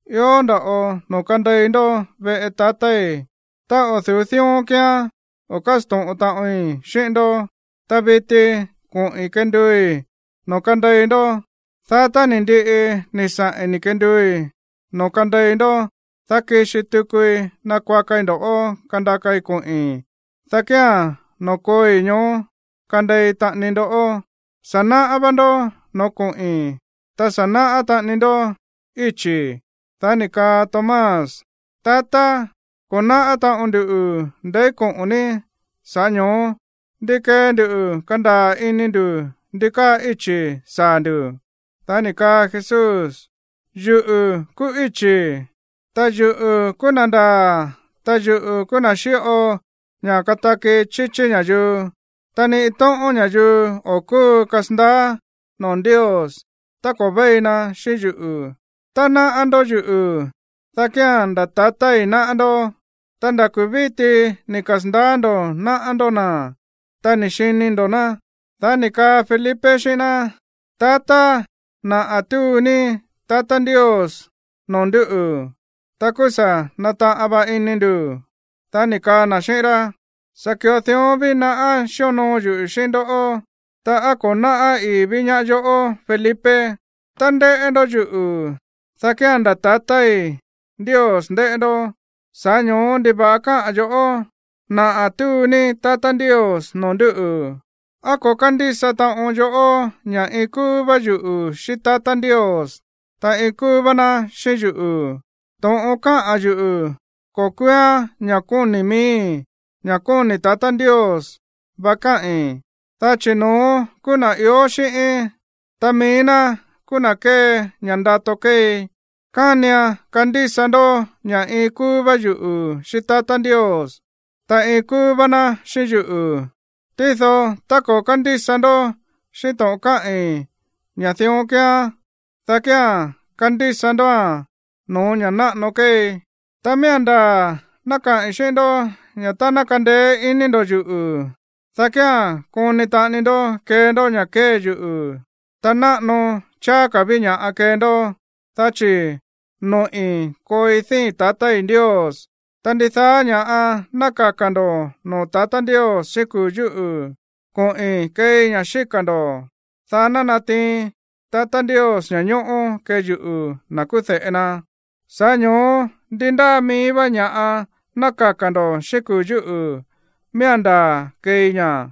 Ió nda̱ꞌo noo̱ kandei ndó veꞌe tatái̱. Tá o̱ du̱ú dión kíán, o̱ kásto̱ꞌon taꞌoin xíꞌín ndó. Ta viti koꞌi̱n kenduui̱ noo̱ kandei ndó. Dá tá ni̱ ndiꞌi ni̱ saꞌi̱n ni̱ kenduui̱ noo̱ kandei ndó, dá kixi tukui nakuakai ndo̱ꞌó kandakai koꞌi̱n, dá kía̱n noo̱ kooi, ñoó kandei taꞌani ndó. Sa̱ náꞌá vá ndó no̱ó koꞌi̱n, ta sa̱ náꞌá taꞌani ndó íchi̱. Dá ni̱ kaa Tomás: ―Tatá, ko̱ náꞌá taꞌon nduꞌu̱ ndeí koꞌo̱n ní, sa̱ꞌá ño̱ó, ¿ndi kee nduꞌu̱ kandaa̱ ini ndu̱ ndi káa íchi̱ saa̱ ndu̱? Dá ni̱ kaa Jesús: ―Yuꞌu̱ kúú íchi̱, ta yuꞌu̱ kúú na̱ ndaa̱, ta yuꞌu̱ kúú na̱ xíꞌo ña̱ kataki chíchí ña̱yuu. Ta ni iin tóꞌón ña̱yuu o̱ kúu kasandaá noo̱ Ndios tá ko̱ véi na xíꞌín yuꞌu̱. Tá náꞌá ndó yuꞌu̱, dá kía̱n nda̱ tatái̱ náꞌá ndó. Ta nda̱ kuu̱ víti ni̱ kasa̱ndaá ndo̱ náꞌá ndó na̱, ta ni̱ xini ndo̱ ná. Dá ni̱ kaa Felipe xíꞌín ná: ―Tatá, naꞌa̱ túu ní tatá Ndios noo̱ ndúꞌu̱, ta kúú sa̱ nataꞌan va ini ndu̱. Dá ni̱ kaa na̱ xíꞌín rá: ―Sa̱ ki̱ꞌo dión ví naꞌá xíonoo yuꞌu̱ xíꞌín ndoꞌó, ta ¿á ko̱ náꞌá ii̱ ví ñaá yoꞌó, Felipe? Tá ndéꞌé ndó yuꞌu̱, dá kía̱n nda̱ tatái̱ Ndios ndéꞌé ndó. Sa̱ꞌá ño̱ó, ¿ndiva̱ꞌa káꞌa̱n yo̱ꞌó: “Naꞌa̱ túu ní tatá Ndios noo̱ ndúꞌu̱”? ¿Á ko̱ kándísa taꞌon yoꞌó ña̱ iin kúú vá yuꞌu̱ xíꞌín tatá Ndios, ta iin kúú vá ná xíꞌín yuꞌu̱? To̱ꞌon káꞌa̱n yuꞌu̱, ko̱ kúúán ña̱ kóni̱ miíi̱, ña̱ kóni̱ tatá Ndios va káꞌi̱n, dá chi̱ no̱ón kúú na̱ ió xíꞌíín, ta mií ná kúú na̱ kée ña̱ ndato kéei. Kánian kandísa ndó ña̱ iin kúú vá yuꞌu̱ xíꞌín tatá Ndios, ta iin kúú vá ná xíꞌín yuꞌu̱. Tído tá ko̱ kándísa ndó xíꞌín to̱ꞌon káꞌi̱n ña̱ dión kíán, dá kía̱n kandísa ndóa̱n no̱ó ña̱ náꞌano kéei. ’Ta miía̱n ndaa̱ ná kaꞌi̱n xíꞌín ndó ña̱ tá ná kandeé iní ndo̱ yuꞌu̱, dá kía̱n koni taꞌani ndó kee ndó ña̱ kée yuꞌu̱. Ta náꞌano cháá ka̱ ví ña̱ꞌa kee ndó, dá chi̱ noꞌi̱ kooi díi̱n tatái̱ Ndios. Ta ndidaá ña̱ ná kaka̱ ndo̱ noo̱ tatá Ndios xíꞌín kuu̱ yúꞌu̱, koꞌi̱n keei ña̱ xíka̱ ndo̱, dá ná natiin tatá Ndios ña̱ñóꞌó kee yuꞌu̱, na̱ kúú de̱ꞌe na. Sa̱ꞌá ño̱ó ndi ndáa mií vá ña̱ꞌa ná kaka̱ ndo̱ xíꞌín kuu̱ yúꞌu̱, miía̱n ndaa̱ keei ña̱.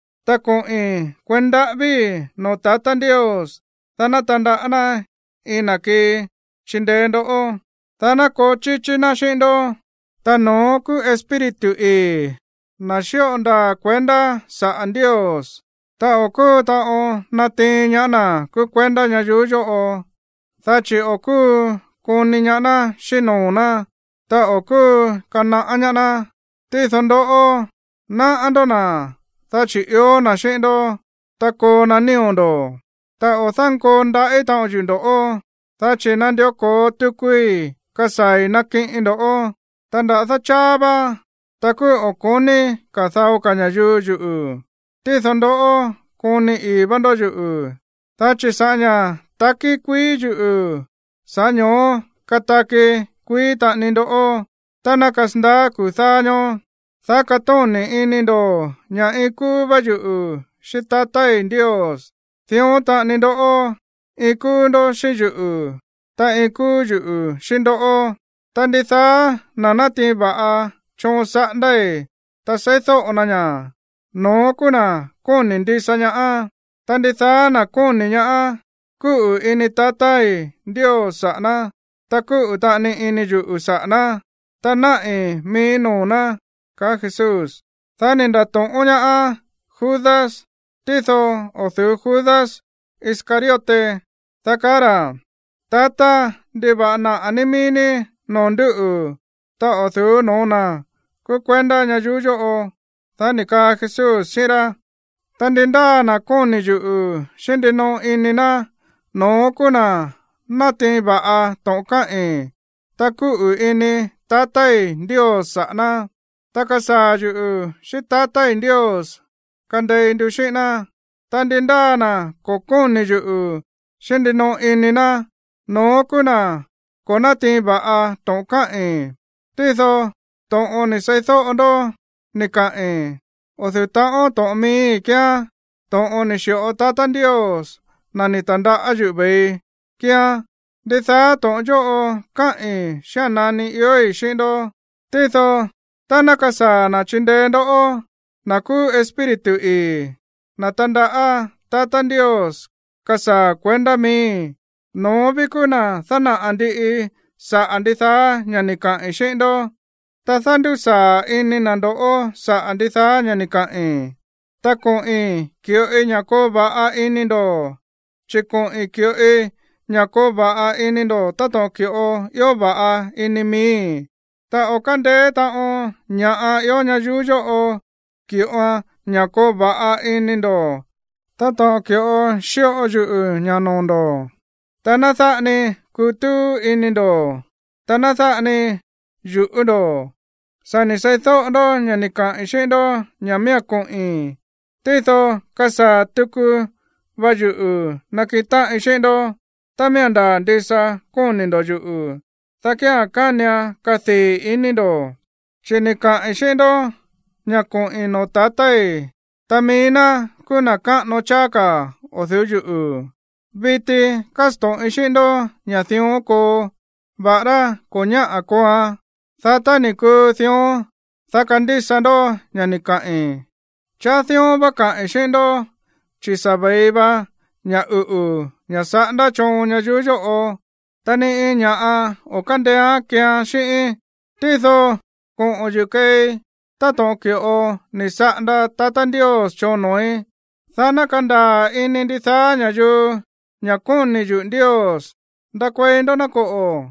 Ta koꞌi̱n kueí ndaꞌávíi̱ noo̱ tatá Ndios, dá ná tandaꞌá ná iin na̱ kii chindeé ndoꞌó, dá ná koo chíchí ná xíꞌín ndó. Ta no̱ón kúú Espíritu ii̱, na̱ xíꞌo ndaa̱ kuendá saꞌa̱ Ndios. Ta o̱ kúu taꞌon natiin ñaá na̱ kúú kuendá ñayuú yóꞌo, dá chi̱ o̱ kúu koni ñaá ná xíꞌín noo̱ ná, ta o̱ kúu kanaꞌá ñaá ná. Tído ndoꞌó, náꞌá ndó na̱, dá chi̱ ió na̱ xíꞌín ndó, ta koo na nío̱ ndo̱. ’Ta o̱ dánkoo ndaꞌí taꞌon yuꞌu̱ ndo̱ꞌó, dá chi̱ nandió ko̱o tukui kasaa̱i̱ nakiꞌin ndó. Ta nda̱dá cháá vá, ta kúú o̱ ko̱ní ka̱ dao ka̱ ña̱yuu yuꞌu̱. Tído ndoꞌó, koni ii̱ va ndó yuꞌu̱. Dá chi̱ sa̱ꞌá ña̱ takí kuií yuꞌu̱, sa̱ꞌá ño̱ó kataki kuií taꞌani ndoꞌó. Tá ná kasandaá kuu̱ dáá ñóó, dá katóni̱ ini ndo̱ ña̱ iin kúú vá yuꞌu̱ xíꞌín tatái̱ Ndios. Dión taꞌani ndoꞌó, iin kúú ndó xíꞌín yuꞌu̱, ta iin kúú yuꞌu̱ xíꞌín ndoꞌó. Ta ndidaá na̱ natiin va̱ꞌa choon saꞌándái̱, ta seídóꞌo na ña̱, no̱ón kúú na̱ kóni̱ ndisa ñaá. Ta ndidaá na̱ kóni̱ ñaá, kúꞌu̱ ini tatái̱ Ndios saꞌa̱ ná, ta kúꞌu̱ taꞌani ini yuꞌu̱ saꞌa̱ ná, ta naꞌi̱ miíí noo̱ ná ―kaá Jesús. Dá ni̱ nda̱to̱ꞌón ñaá Judas (tído o̱ du̱ú Judas Iscariote), dá kaá ra̱: ―Tatá, ¿ndiva̱ꞌa naꞌa̱ ní mií ní noo̱ ndúꞌu̱, ta o̱ du̱ú no̱ó na̱ kúú kuendá ñayuú yóꞌo? Dá ni̱ kaa Jesús xíꞌín rá: ―Ta ndi ndáa na̱ kóni̱ yuꞌu̱ xíꞌín ndinoꞌo ini na̱, no̱ón kúú na̱ natiin va̱ꞌa to̱ꞌon káꞌi̱n, ta kuꞌu̱ ini tatái̱ Ndios saꞌa̱ ná, ta kasaa̱ yuꞌu̱ xíꞌín tatái̱ Ndios kandei ndu xíꞌín ná. Ta ndí ndáa na̱ ko̱ kóni̱ yuꞌu̱ xíꞌín ndinoꞌo ini na̱, no̱ón kúú na̱ ko̱ nátiin va̱ꞌa to̱ꞌon káꞌi̱n. Tído to̱ꞌon ni̱ seídóꞌo ndó ni̱ kaꞌi̱n, o̱ du̱ú ta̱ꞌón to̱ꞌon miíí kíán. To̱ꞌon ni̱ xi̱ꞌo tatá Ndios, na̱ ni̱ ta̱ndaꞌá yuꞌu̱ ve̱ii, kíán. ’Ndidaá to̱ꞌon yóꞌo káꞌi̱n xía̱n nani iói̱ xíꞌín ndó. Tído tá ná kasaa̱ na̱ chindeé ndoꞌó, na̱ kúú Espíritu ii̱, na̱ tandaꞌá tatá Ndios kasaa̱ kuendá miíi̱, no̱ón ví kúú na̱ dánaꞌa̱ ndiꞌi saꞌa̱ ndidaá ña̱ ni̱ kaꞌi̱n xíꞌín ndó, ta dándusaa̱ ini na̱ ndoꞌó saꞌa̱ ndidaá ña̱ ni̱ kaꞌi̱n. ’Ta koꞌi̱n ki̱ꞌoi ña̱ koo va̱ꞌa ini ndo̱, chi̱ koꞌi̱n ki̱ꞌoi ña̱ koo va̱ꞌa ini ndo̱ táto̱ꞌon ki̱ꞌo ió va̱ꞌa ini miíí. Ta o̱ kándeé taꞌon ña̱ꞌa ió ñayuú yóꞌo ki̱ꞌoan ña̱ koo va̱ꞌa ini ndo̱ táto̱ꞌon ki̱ꞌo xíꞌo yuꞌu̱ ña̱ noo̱ ndo̱. Ta ná dáꞌa ni kutúú ini ndo̱, ta ná dáꞌa ni yu̱ꞌú ndo̱. Sa̱ ni̱ seídóꞌo ndó ña̱ ni̱ kaꞌi̱n xíꞌín ndó ña̱ miía̱n koꞌi̱n, tído kasaa̱ tuku va yuꞌu̱ nakiꞌin táꞌin xíꞌín ndó. Tá miía̱n ndaa̱ ndisa kóni̱ ndo̱ yuꞌu̱, dá kía̱n kánian kadii̱ ini ndo̱, chi̱ ni̱ kaꞌi̱n xíꞌín ndó ña̱ koꞌi̱n noo̱ tatái̱, ta mií ná kúú na̱ káꞌano cháá ka̱ o̱ du̱ú yuꞌu̱. Viti kásto̱ꞌin xíꞌín ndó ña̱ dión koo, va̱ꞌará ko̱ ñáꞌa̱ kooan, dá tá ni̱ kuu dión, dá kandísa ndó ña̱ ni̱ kaꞌi̱n. ’Cháá dión vá kaꞌi̱n xíꞌín ndó, chi̱ sa̱ ve̱i va ña̱ uꞌu̱, ña̱ saꞌándá choon ñayuú yóꞌo, ta ni iin ña̱ꞌa o̱ kándeéán keean xíꞌíín. Tído koꞌo̱n yuꞌu̱ keei táto̱ꞌon ki̱ꞌo ni̱ saꞌanda tatá Ndios choon noo̱í, dá ná kandaa̱ ini ndidaá ña̱yuu ña̱ kóni̱ yuꞌu̱ Ndios. Ndakuei ndó, ná koꞌo̱.